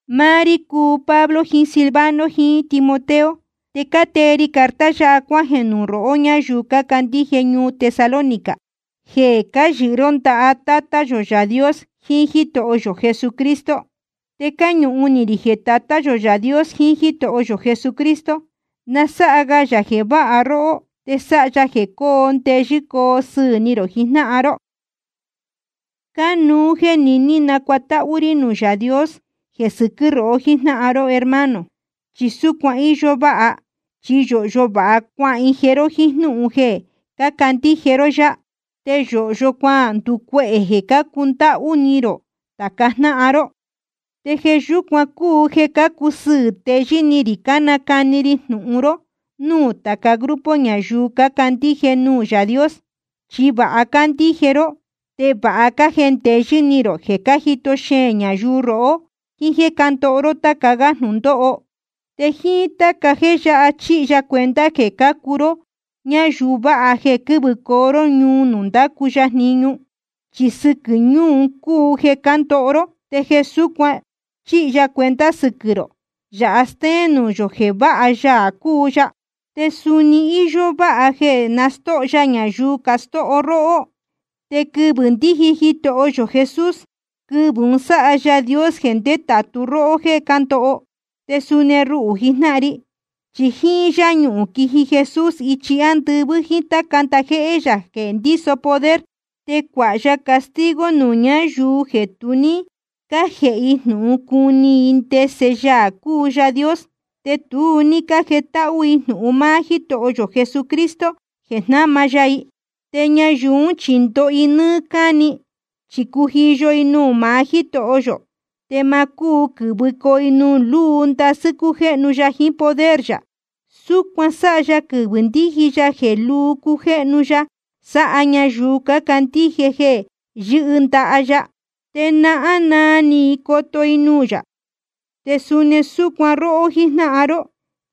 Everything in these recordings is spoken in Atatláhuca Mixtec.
Máá rí cúu Pablo jiín Silvano jiín Timoteo, te cátee ri carta yáha cuájeē nuū rohó ñáyuu cácandíje ñuu Tesalónica, jeē cáyɨhɨ ró ndaha Tátá yō Yaā Dios jiín Jítoho yō Jesucristo. Te cáñuhun ni rī jeē Tatá yō Yaā Dios jiín Jítoho yō Jesucristo, na sáha ga yā jeē váha róhó, te sáha ya jeē coo ndeyɨ́ coo sɨɨ̄ ni rō jijnáhan ró. Cánuú jéē niní nacuatáhú rí nuū Yaā Dios jeē sɨquɨ́ rohó jíjnáhan ró hermano. Chi súcuan íyó váha, chi yōhyo vāha cuahije ró jíín jnúhun jeē cácandíje ró yá, te yōhyo cuanducuehē jeē cácundáhú ni rō tāca jnáhan ró. Te jeē yúcuan cúu jeē cácusɨɨ̄ teyɨ́ ni rī cánacani ri jnūhun ró núū tāca grupo ñayuu cácandíje nuū Yaā Dios. Chi vāha cácandíje ró, te vāha cájendeyɨ́ ni rō jeē cájito xeēn ñayuu rohó jíín jéē cándoho ró táca gá jnūndóho. Te jíín táca jéē yáha chíhi ya cuenta jeē cácuu ró ñáyuu váha jeē quɨ́vɨcoo ró ñuu nuū ndácu ya jniñu. Chi sɨquɨ̄ ñuu un cúu jeē cándoho ró. Te jeē súcuan chíhi ya cuenta sɨquɨ̄ rō, yāha stéén nuū yō jeē vāha Yaā cúu ya. Te suni íyó váha jeē nastóho ya ñayuu castóho róhó. Te quɨvɨ̄ ndíji Jitoho yō Jesús, quɨvɨ̄ un sáha Yaā Dios jeē ndétātu róhó jéē cándoho, te suni ruhū jijnáhan ri. Chi jíín yáñuhūn quiji Jesús ichi ándɨvɨ́ jíín táca ndajéhé yā jeē ndíso poder. Te cuāha ya castigo nuū ñáyuu jeē tu ní cájēhe i jnūhun cuni i ndese Yaā cúu Yaā Dios, te tu ní cájetáhú i jnūhun máá Jítoho yō Jesucristo jeē jnáma ya i. Te ñayuu ún chi ndoho i nɨ́ɨ́ cáni, chi cujiyo i nuū maá Jítoho yō, te ma cúu quɨ̄vɨcoo i nuū lúu ndasɨ́ cújéhnu ya jiín poder yā. Súcuan sáha ya quɨvɨ̄ ndíji ya jeē lúu cujéhnu ya sáha ñayuu cácandíje jeē yɨ́hɨ ndaha ya. Te nahán naa ni i coto i nuū yā. Te suni súcuan róhó jíjnáhan ró,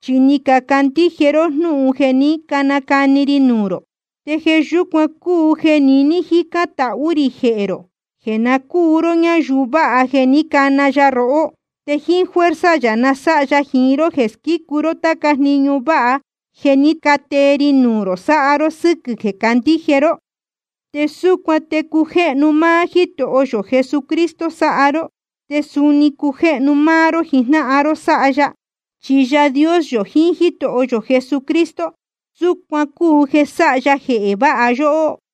chi ni cacandíje ró jnúhun jeē ní canacani ri nuū rō. Te jeē yúcuan cúu jeē niní cájicān tahú rī jehē rō, jeē na cúu ró ñáyuu vāha jeē ní cana ya rohó. Te jíín fuerza yā na sáha ya jiín ró jeē squícu ró táca jniñu váha jeē ní catee ni rō sáha ró sɨ́quɨ̄ jeē cácandíje ró. Te súcuan te cujéhnu máá Jítoho yō Jesucristo sáha ró, te suni cujéhnu máá ró jijnáhan ró sáha ya. Chi Yaā Dios yō jiín Jítoho yō Jesucristo, súcuan cúu jeē sáha ya jeē váha yóhó.